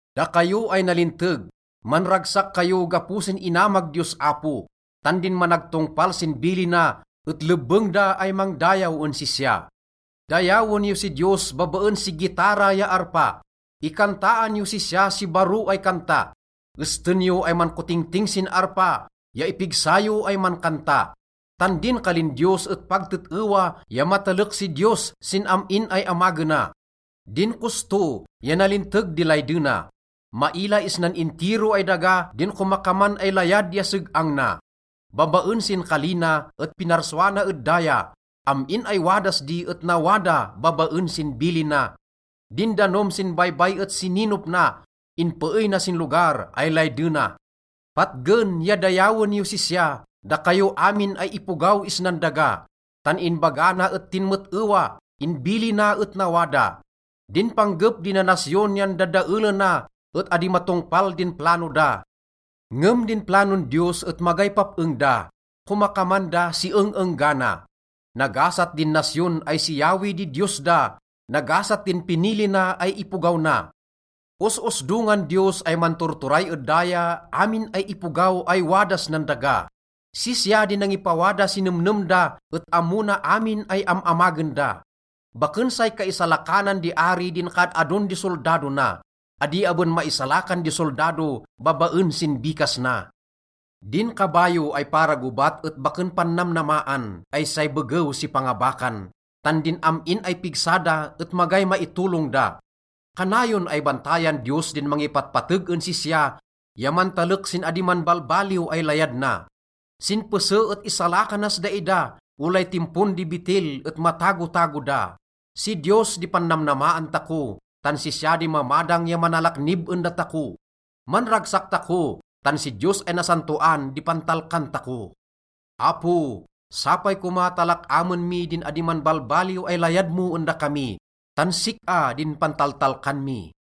Dakayo ay nalinteg, manragsak kayo gapo sin inamag Diyos Apo. Tan din managtongpal sin bilina et lebbeng da ay mangdayaw en sisya. Dayawen yo si Diyos babaen si gitara ya arpa. Ikantaan yos sisya si baro ay kanta. Esten yo ay mankotingting sin arpa ya ipigsa yo ay mankanta. Tan din kalin Diyos et pag tet-ewa ya matalek si Diyos sin amin ay amagena. Din kosto ya nalinteg di laydena. Maila isnan intiro ay daga din komakaman ay layad ya seg-ang na. Babaen sin kali na et pinarsua na ed daya. Amin ay wadas di et nawada babaen sin bilina. Din danom sin baybay et sininop na, inpeey na sin lugar ay laydena. Patgen ya dayawen yos sisya, dakayo amin ay ipogaw isnan daga. Tan inbaga na et tinmet-ewa, inbilina et nawada. Din panggep di nanasyon yan dadaelena et adi matongpal din plano da. Ngem din planon Diyos et magay pap-eng da, komakaman da si eng-enggana. Nagasat din nasyon ay si Yahweh di Diyos da, nagasat din pinili na ay ipogaw na. Os-osdongan Diyos ay manturturay ed daya amin ay ipogaw ay wadas nan daga. Sisya di nangipawada si nemnem da et ammo na amin ay am-amagen da. Baken say kaisalakanan di ari din kaad-adon di soldado na. Adi aben maisalakan di soldado babaen sin bikas na. Din kabayo ay para gobat et baken pannamnamaan ay say begew si pangabakan. Tan din am-in ay pigsa da et magay maitolong da. Kanayon ay bantayan Diyos din mangipatpateg en sisya ya mantalek sin adi manbalbaliw ay layad na. Sin pese et isalakanas daida, olay timpon di betil et matagotago da. Si Diyos di pannamnamaan tako, tan sisya di mamadang ya manalaknib en datako. Manragsak tako, tan si Diyos ay nasantoan di pantalkan tako. Apo, sapay koma ta lak-amen mi din adi manbalbaliw ay layad mo en dakami, tan sik-a din pantaltalkan mi.